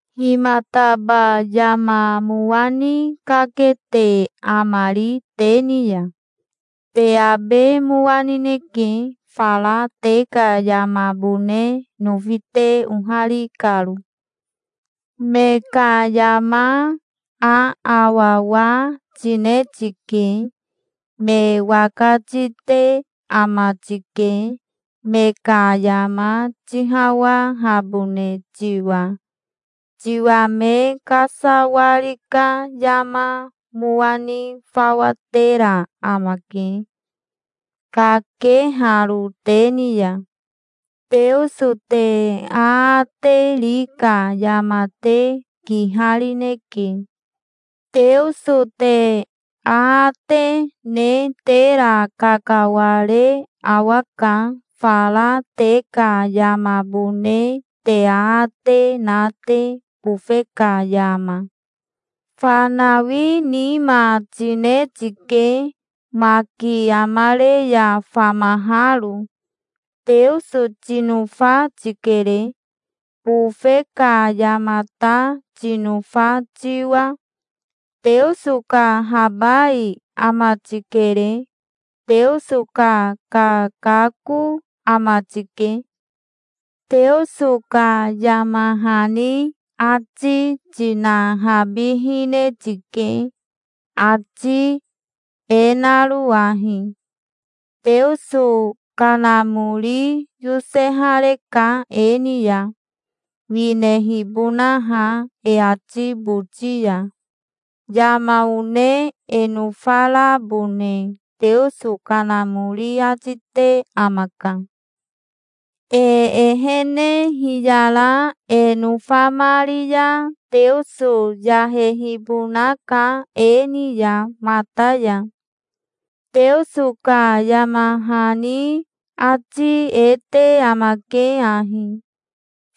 Himataba yama mowa ni kakete amari te ni ya? Te abe mowa nineke, fara te ka yamabone nofi te ohari karo. Me ka yama aawawa tine tike. Me waka tite ama tike, me ka yama tihawahabone tiwa. Tiwa me kasawari ka yama mowa ni fawa tera amake, kakeharo te ni ya. Teoso te aate ri ka yama te kiharineke. Teoso te aate ne tera kakaware awaka, fara te ka yamabone te aate na te, bofe ka yama. Fanawi nima tine tike, maki amare ya famaharo. Teoso tinofa tikere, bofe ka yama ta tinofa tiwa. Teoso ka habai ama tikere. Teoso ka kakako ama tike. Teoso ka yama hani ati tinahabihine tike, ati e naro ahi: Teoso Kanamori yosehareka e ni ya, winehibonaha e ati boti ya. Yama one e nofarabone Teoso Kanamori ati te amaka. E ehene hiyara e nofamari ya Teoso yahehibonaka e ni ya mata ya. Teoso ka yama hani ati e te amake ahi: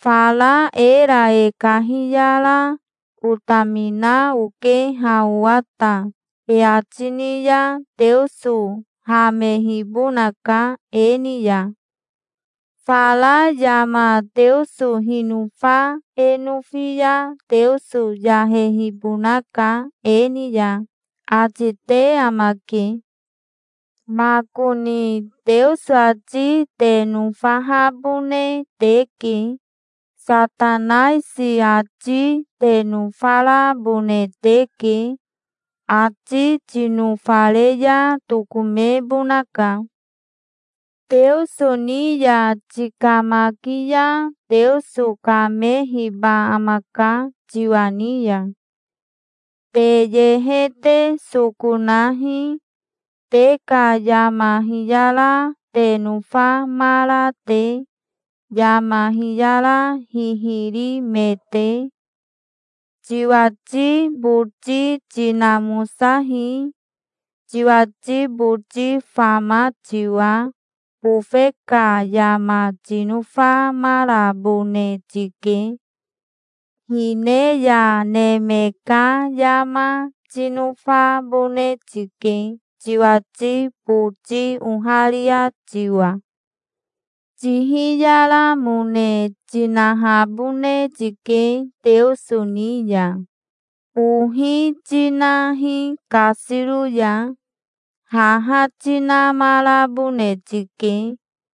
"Fara era e kahiyara 'Otamina oke ha owa ta', e ati ni ya Teoso hamehibonaka e ni ya. Fara yama Teoso hinofa e nofi ya Teoso yahehibonaka e ni ya", ati te amake. Makoni Teoso ati te nofahabone teke. Satanaisi ati te nofarabone teke. Ati tinofare ya tokomebonaka. Teoso ni ya tikamaki ya Teoso kamehiba amaka tiwa ni ya. Te yehe te soko nahi, te ka yama hiyara te nofamara te, yama hiyara hihiri me te. Tiwati boti tinamosahi, tiwati boti fama tiwa. Bofe ka yama tinofamarabone tike. Hine ya neme ka yama tinofabone tike, tiwati boti oharia tiwa. Tihiyaramone tinahabone tike Teoso ni ya. Ohi tinahi kasiro ya. Haha tinamarabone tike.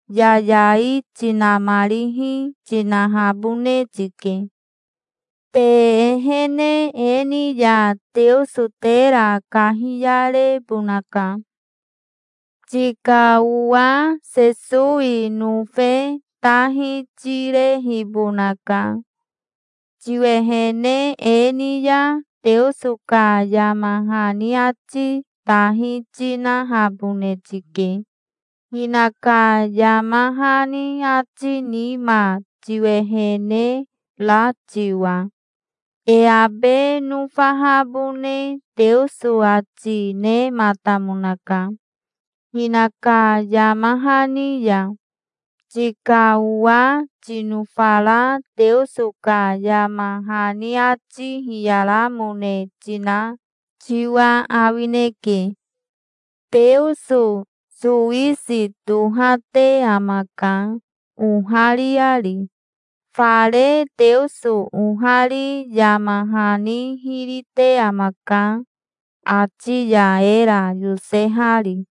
Yayai tinamarihi tinahabone tike. Te ehene e ni ya Teoso tera kahiyarebonaka. Tika owa Sesowi nofe tahi tirehibonaka. Tiwehene e ni ya Teoso ka yama hani ati tahi tinahabone tike, hinaka yama hani ati nima tiwehene ra tiwa. E abe nofahabone Teoso ati nematamonaka, hinaka yama hani ya. Tika owa tinofara Teoso ka yama hani ati hiyaramone tina tiwa awineke. Teoso sowisi tohate amaka, ohariari. Fare Teoso ohari yama hani hiri te amaka, ati ya era yosehari.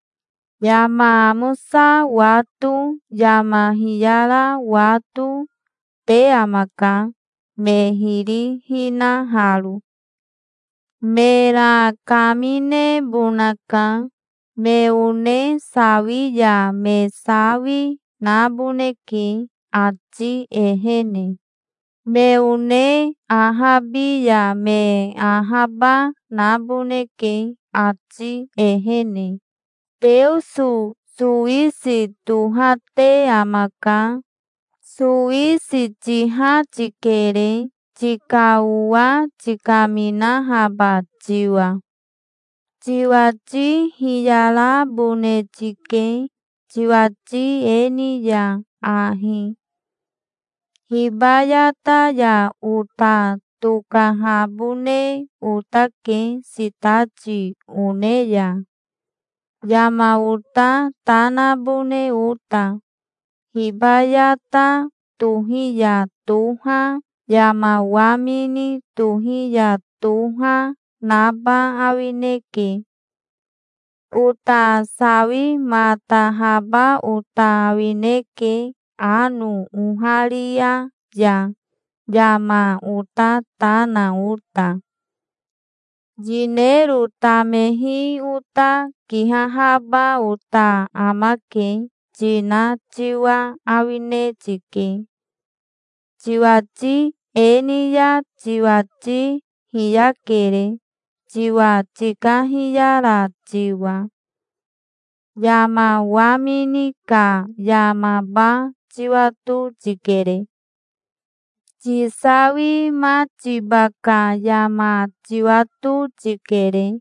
Yama amosa wato, yama hiyara wato, te amaka, me hiri hinaharo. Mera kaminebonaka. Me one sawi ya me sawi naboneke, ati ehene. Me one ahabi ya me ahaba naboneke, ati ehene. Teoso sowisi tohate amaka. Sowisi tiha tikere, tika owa tikaminahaba tiwa. Tiwati hiyarabone tike, tiwati e ni ya ahi: "Hibayata ya ota tokahabone otake sitati one ya, yama ota ta nabone ota. Hibayata tohi ya toha, yama wamini tohi ya toha, naba awineke. Ota sawimatahaba ota awineke ano oharia ya, yama ota ta na ota. Yinero tamehi ota kihahaba ota amake", tina tiwa awine tike. Tiwati e ni ya tiwati hiyakere, tiwa tikahiyara tiwa. Yama wamini ka yamaba tiwato tikere. Tisawimatiba ka yama tiwato tikere.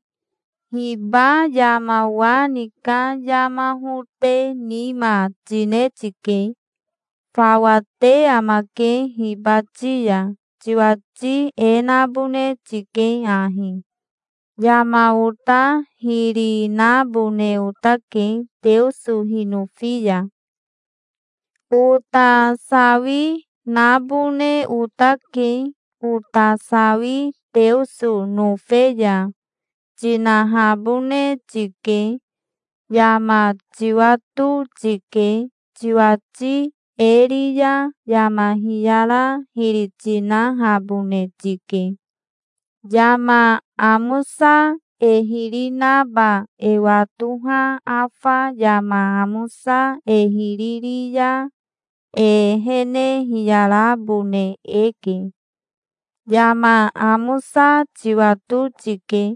Hiba yama wa ni ka yama hote nima tine tike. Fawa te amake hibati ya. Tiwati e nabone tike ahi: "Yama ota hiri nabone otake, Teoso hinofi ya. Ota sawi nabone otake, ota sawi Teoso nofe ya", tinahabone tike. Yama tiwato tike. Tiwati e ri ya yama hiyara hiri tinahabone tike. Yama amosa e hiri naba e watoha afa yama amosa e hiri ri ya e ehene hiyarabone eke. Yama amosa tiwato tike.